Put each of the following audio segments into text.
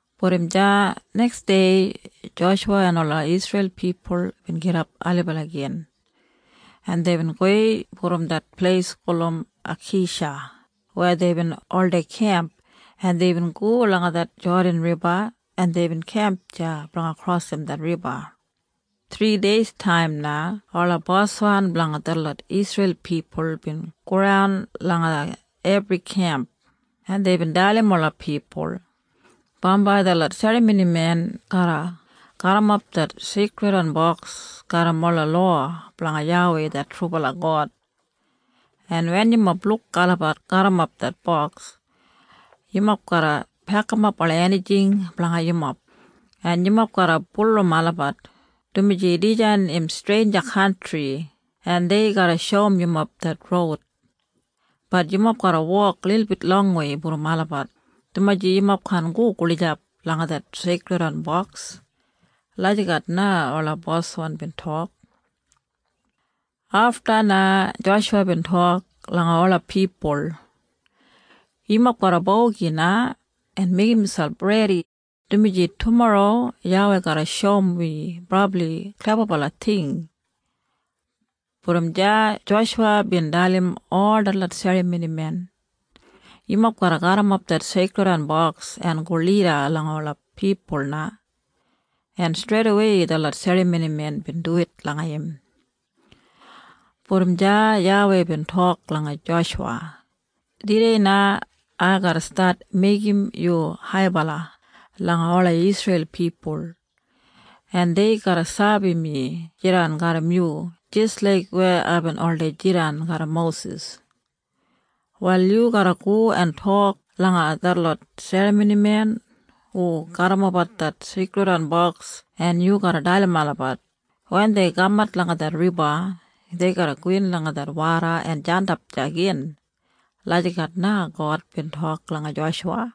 Brom deya neksdei Joshuwa en ola Isreil pipul bin gidap ailibala gin, en deibin gowei brom det pleis gulum Akeisha weya deibin oldei kemp, en deibin go langa det Jodan Riba, en deibin kemp deya blanga krosim det riba. Thrideistaim na ola boswan blanga detlot Isreil pipul bin goran langa ebri kemp, en deibin dalim ola pipul, “Bambai detlot serramonimen garra garrimap det Seikridwan Boks garram ola lowa blanga YAWEI det trubala God. En wen yumob luk olabat garrimap det boks, yumob garra pekimap ola enijing blanga yumob, en yumob garra bulurrum olabat, dumaji dijan im streinja kantri, en dei garra shoum yumob det roud. Bat yumob garra wok lilbit longwei brom olabat, dumaji yumob kaan go gulijap langa det Seikridwan Boks.” Lagijat na ola boswan bin tok. Afta na Joshuwa bin tok langa ola pipul, “Yumob garra bogi na en meigim miselp redibala, dumaji tumorro YAWEI garra shoum wi brabli klebabala ting.” Brom deya Joshuwa bin dalim ol detlot serramonimen, “Yumob garra garrimap det Seikridwan Boks en go lida langa ola pipul na.” En streidawei detlot serramonimen bin duwit langa im. Brom deya YAWEI bin tok langa Joshuwa, “Tudei na ai garra stat meigim yu haibala langa ola Isreil pipul, en dei garra sabi mi jidan garram yu jis laik weya aibin oldei jidan garram Mosis. Wal yu garra go en tok langa detlot serramonimen hu garrimapbat det Seikridwan Boks en yu garra dalim olabat, wen dei kamat langa det riba, dei garra gowin langa det woda en jandap deya gin.” Lagijat na God bin tok langa Joshuwa.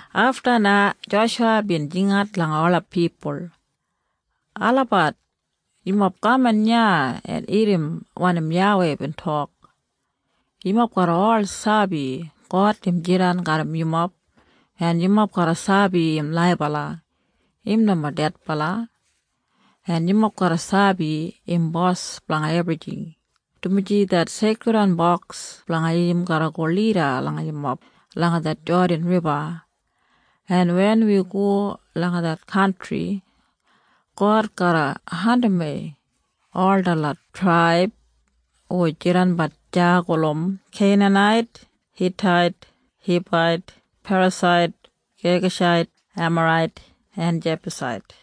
Afta na Joshuwa bin jingat langa ola pipul, “Olabat! Yumob kaman iya en irrim wanim YAWEI bin tok. Yumob garra ol sabi God im jidan garram yumob, en yumob garra sabi im laibala. Im nomo dedbala. En yumob garra sabi im bos blanga ebrijing, dumaji det Seikridwan Boks blanga im garra go lida langa yumob langa det Jodan Riba, en wen wi go langa det kantri, God garra andimwei ol detlot traib hu jidanbat deya gulum Keinanait, Hitait, Hibait, Perasait, Gegashait, Emarait en Jebusait.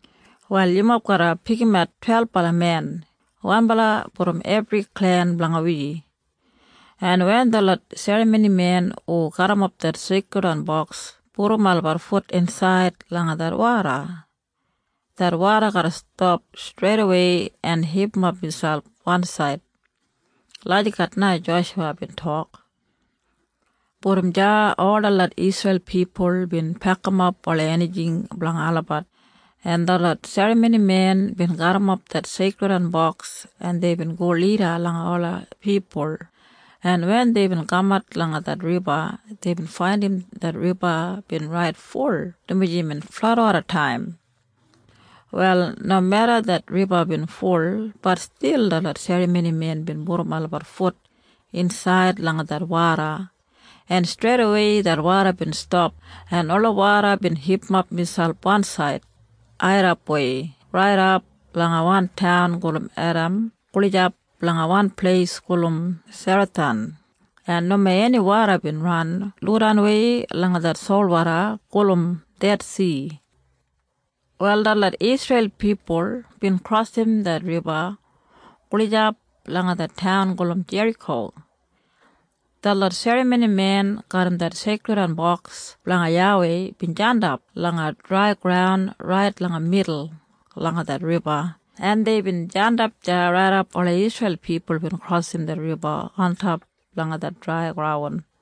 “Wal yumob garra pikimat twelbala men, wanbala brom ebri klen blanga wi, en wen detlot serramonimen hu garrimap det Seikridwan Boks pudum olabat fut insaid langa det woda, det woda garra stap streidawei en hipimap miselp wansaid.” Lagijat na Joshuwa bin tok. Brom deya ol detlot Isreil pipul bin pekimap ola enijing blanga olabat, en detlot serramonimen bin garrimap det Seikridwan Boks, en deibin go lida langa ola pipul, en wen deibin kamat langa det riba, deibin faindim det riba bin rait ful dumaji imbin fladwodataim. Wal nomeda det riba bin ful, bat stil detlot serramonimen bin pudum olabat fut insaid langa det woda, en streidawei det woda bin stap en ola woda bin hipimap miselp wansaid, airrapwei raidap langa wan taun gulum Edam gulijap langa wan pleis gulum Serathan, en nomo eni woda bin ran lodanwei langa det solwoda gulum Dedsi. Wal detlot Isreil pipul bin krosim det riba gulijap langa det taun gulum Jeriko. Detlot serramonimen garram det Seikridwan Boks blanga YAWEI bin jandap langa drai graun rait langa midul langa det riba, en deibin jandap deya raidap ola Isreil pipul bin krosim det riba ontop langa det drai graun.